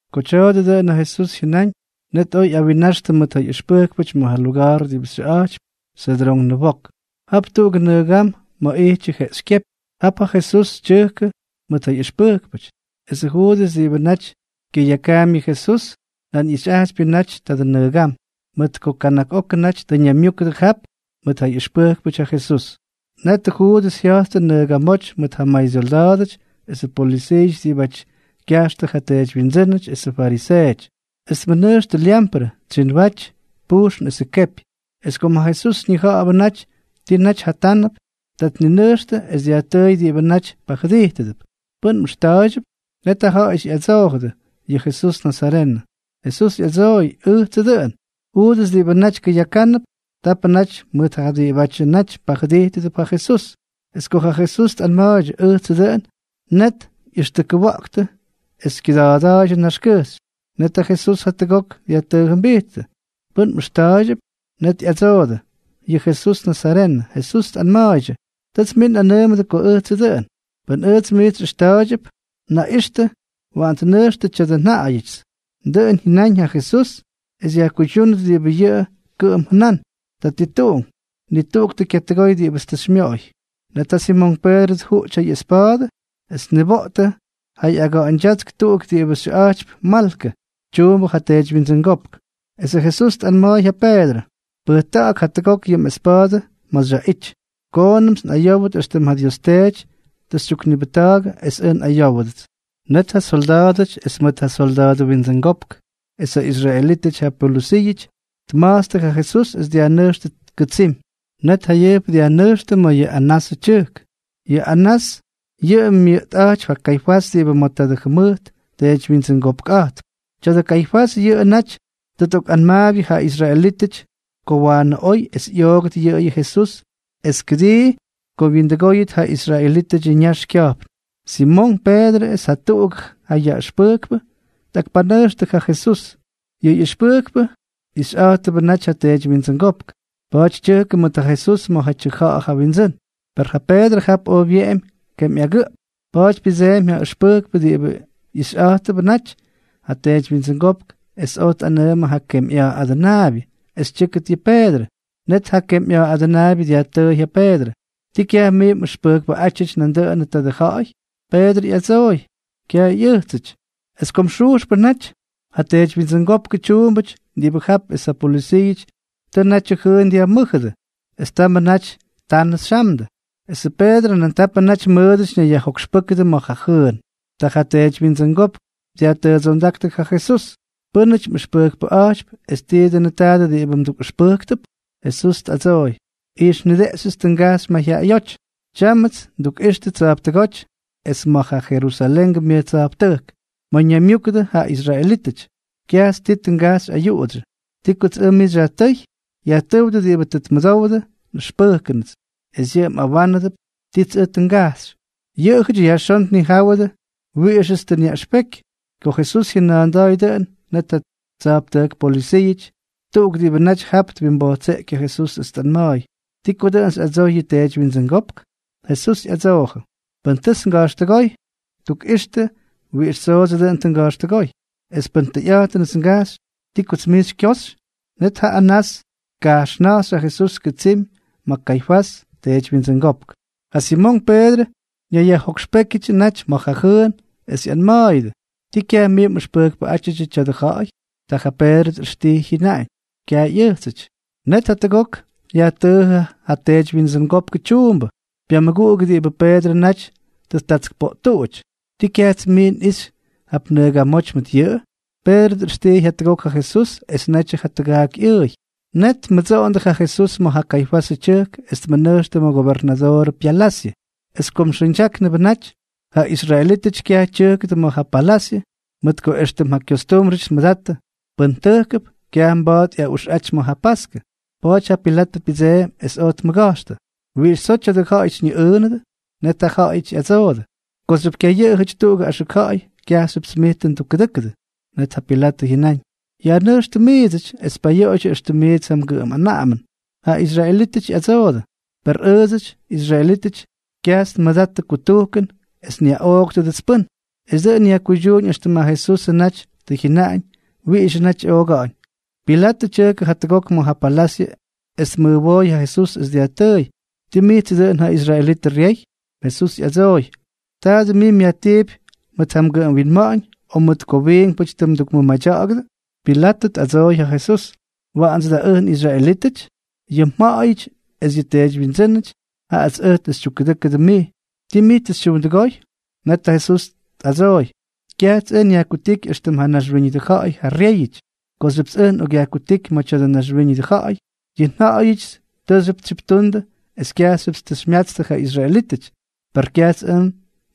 Ko tya̱a̱dʉ dʉꞌʉn ja Jesús jyʉnáñ, net oj ꞌyawinnaxtʉ mʉt ja ꞌyʉxpʉjkpʉty ma̱ ja luga̱a̱r diꞌibʉ xyʉꞌa̱jtypy Sedrón Nʉwok. Jap tuꞌugʉ nʉgam ma̱ ꞌyityʉ jeꞌxykyépy. Jap ja Jesús tyʉjkʉdʉ mʉt ja ꞌyʉxpʉjkpʉty. Esʉ Juudʉs diꞌibʉ naty kyʉyakaampy yʉ Jesús, nan ꞌyixyꞌajtypyʉ natyʉ tadʉ nʉgam, mʉt ko kana̱k okʉ naty tʉ ñaymyúkʉdʉ jap mʉt ja ꞌyʉxpʉjkpʉty ja Jesús. Netʉ Juudʉs jya̱jttʉ nʉgamóty mʉʉt ja maysyolda̱a̱dʉty esʉ polʉsiiʉty diꞌibʉ kyajxtʉ ja teedywyindsʉ́nʉty esʉ fariseeʉty. Es tmʉnʉjxtʉ lyamprʉ, tsyinwaty, pujxn esʉ kepy. Es kom ja Jesús ñija̱ꞌa̱bʉ naty ti naty jatánʉp, ta tninʉjxtʉ es dyajtʉʉy diꞌibʉ naty pajʉdijtʉdʉp: —¿Pʉ́n mꞌʉxta̱a̱ydyʉp? Net jaꞌajʉty ꞌyadsoojʉdʉ: —Yʉ Jesús nazarenʉ. Jesús ꞌyadsooy: —Ʉjtsʉ dʉꞌʉn. Juudʉs diꞌibʉ naty kʉyakánʉp, tapʉ naty mʉt ja diꞌibʉdyʉ naty pajʉdijttʉp ja Jesús. Es ko ja Jesús tꞌanma̱a̱ydyʉ: “Ʉjtsʉ dʉꞌʉn”, net ꞌyʉxtʉkʉwa̱ꞌktʉ es kyʉda̱a̱dʉ naxkʉjxy. Net ja Jesús jatʉgok dyajtʉʉjʉmbijttʉ: —¿Pʉ́n mꞌʉxta̱a̱ydyʉp? Net ꞌyadsoodʉ: —Yʉ Jesús nazarenʉ. Jesús tꞌanma̱a̱ydyʉ: —Tʉts mij nꞌanʉʉmʉdʉ ko ʉjtsʉ dʉꞌʉn. Pʉn ʉjts miits xyꞌʉxta̱a̱ydyʉp, naꞌixtʉ, waꞌan tnʉjxtʉ tya̱dʉ nja̱ꞌa̱yʉts. Dʉꞌʉn jyʉnáñ ja Jesús es yajkuydyúnʉt diꞌibʉ yʉꞌʉ kʉꞌʉm jʉnán: “Tatituꞌunk, ni tuꞌuk tʉ kyatʉgoy diꞌibʉts mij xymyooy.” Net ja Simonk Peedrʉ tjuꞌty ja ꞌyespa̱a̱dʉ es tniboꞌtʉ ja ꞌyaga̱ꞌa̱ñdyátsk tuꞌuk diꞌibʉ xyʉꞌa̱jtypy Malkʉ, tyuumbʉ ja teedywyindsʉngópk. Esʉ Jesús tꞌanma̱a̱y ja Peedrʉ: —Pʉjta̱ꞌa̱k jatʉgok yʉ mꞌespa̱a̱dʉ ma̱ xyaꞌity. Koonʉmts nꞌayówʉt éxtʉm ja Dios Teety tʉ xytyuknibʉjta̱a̱gʉ es ʉj nꞌayówʉdʉts. Net ja solda̱a̱dʉty es mʉt ja solda̱a̱dʉ windsʉngopk esʉ israelítʉty ja pyolʉsiiʉty tma̱jtstʉ ja Jesús es dyajnʉjxtʉ kʉtsimy. Net jayʉjp dyajnʉjxtʉ ma̱ yʉ Anasʉ tyʉjk. Yʉ Anás yʉꞌʉ myʉꞌtꞌa̱jtypy ja Kaifás diꞌibʉ ma̱ tadʉ jʉmʉjt teedywyindsʉngopkꞌa̱jtp. Tya̱dʉ Kaifás yʉꞌʉ naty tʉ tꞌokꞌanmaabyʉdʉ ja israelítʉty ko waanʉ oy es ꞌyoogʉt yʉꞌʉyʉ Jesús es kʉdii ko wyindʉgóyʉt ja israelítʉdyʉ ñax kya̱jpn. Simonk Peedrʉ es jatuꞌuk ja ʉxpʉjkpʉ tꞌakpanʉjxtʉ ja Jesús. Yʉ ꞌyʉxpʉjkpʉ ixyꞌa̱jtʉbʉ naty ja teedywyindsʉngópk. Pa̱a̱ty tyʉjkʉ mʉt ja Jesús ma̱ ja tyʉja̱ꞌa̱ ja windsʉ́n. Per ja Peedrʉ jap oj wyeꞌemy kemyꞌagʉꞌp. Pa̱a̱ty pyʉdseemy ja ʉxpʉjkpʉ diꞌibʉ ixyꞌa̱jtʉbʉ naty ja teedywyindsʉngópk es oj tꞌanʉʉmʉ ja kemyꞌa̱a̱ adʉnaabyʉ es tyʉ́kʉt yʉ Peedrʉ. Net ja kemyꞌa̱a̱ adʉnaabyʉ dyajtʉʉy ja Peedrʉ: —¿Tii kyaj mij mꞌʉxpʉjkpʉꞌátyʉty nandʉꞌʉnʉ tadʉ ja̱ꞌa̱y? Peedrʉ ꞌyadsooy: —Kyaj ꞌyʉjtsʉty. Es kom xujxpʉ naty, ja teedywyindsʉngópkʉ tyuumbʉty diꞌibʉ jap es ja polʉsiiʉty tʉ natyʉ jʉʉn dyajmʉ́jʉdʉ, es tamʉ naty tanʉ xyamdʉ. Esʉ Peedrʉ nan tapʉ naty mʉʉdʉty ñayyajjokxpʉ́kʉdʉ ma̱ ja jʉʉn. Ta ja teedywyindsʉngópk dyajtʉʉdsondáktʉ ja Jesús: —¿Pʉ́nʉty mꞌʉxpʉjkpʉꞌa̱jtypy es ti dʉnʉ tadʉ diꞌibʉ mdukꞌʉxpʉjktʉp? Jesús tꞌadsooy: —Ixnideꞌxyʉts tʉ ngajxy mayjyaꞌayóty. Taayʉmts ndukꞌixtʉ tsa̱jptʉgóty es ma̱ ja Jerusalengʉ myʉj tsa̱jptʉjk, ma̱ ñaymyúkʉdʉ ja israelítʉty. Kyajts ti tʉ ngajxy ayuꞌudsyʉ. ¿Ti kots ʉj mij xyajtʉ́y? Yajtʉ́wdʉ diꞌibʉ tʉ tmʉdowdʉ nꞌʉxpʉjkʉnʉts, es yʉꞌʉ mꞌawánʉdʉp tits ʉj tʉ ngajxy. Yʉꞌʉjʉty yajxón tnijáwʉdʉ wiꞌixʉts tʉ nyaꞌʉxpeky. Ko Jesús jyʉna̱a̱nda̱a̱y dʉꞌʉn, net ja tsa̱jptʉjk polʉsiiʉty tuꞌuk diꞌibʉ naty jap twimbojtseꞌky ja Jesús es tꞌanma̱a̱y: —¿Ti ko dʉꞌʉn xyꞌadsoy yʉ teedywyindsʉngópk? Jesús ꞌyadsoojʉ: —Pʉn tʉts nga̱jxtʉgóy, tukꞌixtʉ wiꞌix tsoodsʉ dʉꞌʉn tʉ nga̱jxtʉgóy. Es pʉn tʉyꞌa̱jtʉnʉts ngajxy, ¿ti kots mij xykyoxy? Net ja Anás tkajxna̱jxy ja Jesús kʉtsimy ma̱ ja Kaifás, teedywyindsʉngópk. Ja Simonk Peedrʉ ñayyajjokxpékyʉdyʉ naty ma̱ ja jʉʉn, es ꞌyanma̱a̱yʉdʉ: —¿Ti kyaj mij mꞌʉxpʉjkpʉꞌátyʉdyʉ tya̱dʉ ja̱ꞌa̱y? Ta ja Peedrʉ tꞌʉxtijy, jyʉnáñ: —Kyaj ꞌyʉjtsʉty. Net jatʉgok yajtʉʉjʉ ja teedywyindsʉngópkʉ tyuumbʉ, pyamʉguꞌugʉ diꞌibʉ Peedrʉ naty tʉ ttatskpoꞌttuꞌuty: —¿Tii kyajts mij nꞌijxy jap nʉgamóty mʉt yʉꞌʉ? Peedrʉ tꞌʉxtijy jatʉgok ja Jesús, es netyʉ ja tʉgaak ꞌyʉʉy. Net tmʉdsoꞌondʉ ja Jesús ma̱ ja Kaifasʉ tyʉjk es tmʉnʉjxtʉ ma̱ gobernadoorʉ pyalasyʉ. Es kom xʉʉñdyáknʉbʉ naty, ja israelítʉty kyaj tyʉjkʉdʉ ma̱ ja palasyʉ, mʉt ko éxtʉm ja kyostúmbrʉty tmʉdattʉ, pʉn tʉjkʉp, kyaj mba̱a̱t ꞌyaꞌuxꞌaty ma̱ ja paskʉ. Pa̱a̱ty ja Pilatʉ pyʉdseemy es oj tmʉga̱jxtʉ: —¿Wiꞌix tsoo tya̱dʉ ja̱ꞌa̱y xyñiꞌʉʉnʉdʉ? Net jaꞌajʉty ꞌyadsoodʉ: —Kooxyʉp kyayʉꞌʉjʉty tuꞌugʉ axʉk ja̱ꞌa̱y, kyajxyʉpts mij tʉ ndukkʉdʉ́kʉdʉ. Net ja Pilatʉ jyʉnáñ: —Yajnʉjxtʉ miidsʉty, es payoꞌoydyʉ éxtʉm miits ja mgʉꞌʉm anaꞌamʉn. Ja israelítʉty ꞌyadsoodʉ: —Per ʉʉdsʉty, israelítʉty, kyajts nmʉdattʉ kutujkʉn es nyaꞌooktʉdʉts pʉ́n. Es dʉꞌʉn yajkuydyuuñ éxtʉm ja Jesusʉ naty tʉ jyʉnaꞌañ wiꞌixʉ naty ꞌyooga̱ꞌa̱ñ. Pilatʉ tyʉjkʉ jatʉgok ma̱ ja palasyʉ es tmʉjwooy ja Jesús es dyajtʉʉy: —¿Ti mijtsʉ dʉꞌʉn ja israelitʉ ryey? Jesús ꞌyadsooy: —¿Taadʉ mij myajtiipy mʉt ja mgʉꞌʉm winma̱ꞌa̱ñ, o mʉt ko wiinkpʉty tʉ mdukmʉmadya̱ꞌa̱gʉdʉ? Pilatʉ tꞌadsooy ja Jesús: —¿Waꞌandsʉ da ʉj nꞌisraelítʉty? Yʉ mja̱ꞌa̱yʉty es yʉ teedywyindsʉ́nʉty, jaꞌats ʉj tʉ xytyukkʉdʉ́kʉdʉ mij. ¿Ti mij tʉ xytyuundʉgóy? Net ja Jesús tꞌadsooy: —Kyajts ʉj nyajkutíky éxtʉm ja naxwíñʉdʉ ja̱ꞌa̱y ja ryéyʉty. Kooxyʉpts ʉj nꞌokꞌyajkutíky ma̱ tya̱dʉ naxwíñʉdʉ ja̱ꞌa̱y, yʉ nja̱ꞌa̱yʉdyʉts tʉʉxyʉp tsyiptundʉ es kyajxyʉpts tʉ xymyatstʉ ja israelítʉty. Per kyajts ʉj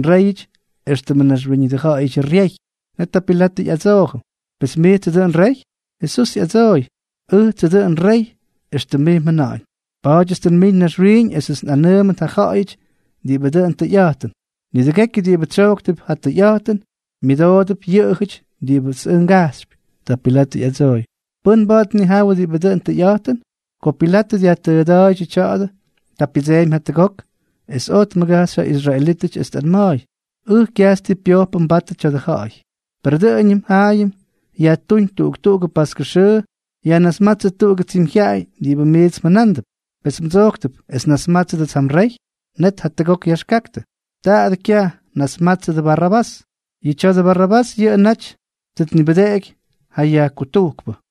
nréyʉty éxtʉmʉ naxwíñʉdʉ ja̱ꞌa̱yʉdyʉ ryey. Net ja Pilatʉ ꞌyadsoojʉ: —Pes, ¿mijtsʉ dʉꞌʉn rey? Jesús ꞌyadsooy: —Ʉjtsʉ dʉꞌʉn rey, éxtʉm mij mjʉna̱ꞌa̱ñ. Pa̱a̱dyʉts tʉ nmiñ naxwiiñ esʉts nꞌanʉʉmʉt ja ja̱ꞌa̱yʉty diꞌibʉ dʉn tʉyꞌa̱jtʉn. Nidʉgekyʉ diꞌibʉ tsyojktʉp ja tʉyꞌa̱jtʉn, myʉdoodʉp yʉꞌʉjʉty diꞌibʉts ʉj ngajxypy. Ta Pilatʉ ꞌyadsooy: —¿Pʉ́n mba̱a̱t tnijawʉ diꞌibʉ dʉn tʉyꞌa̱jtʉn? Ko Pilatʉ dyajtʉʉda̱a̱yʉ tya̱a̱dʉ, ta pyʉdseemy jatʉgok es oj tmʉgajxy ja israelítʉty, es tꞌanma̱a̱y: —Ʉj kyajts ti pyojpʉ nbatʉ tya̱dʉ ja̱ꞌa̱y. Per dʉꞌʉñʉm jaayʉm yajtúñ tuꞌuk tuꞌugʉ paskʉ xʉʉ yajnasmátsʉ tuꞌugʉ tsimyjyaꞌay diꞌibʉ miits mjʉnándʉp. ¿Pes mdsojktʉp es nnasmátsʉdʉts ja mrey? Net jatʉgok yaxkaktʉ: —¡Taadʉ kyaj! ¡Nasmatsʉ Barrabás! Yʉ tya̱dʉ Barrabás yʉꞌʉ naty tʉ tnibʉdeꞌeky ja yajkutujkpʉ.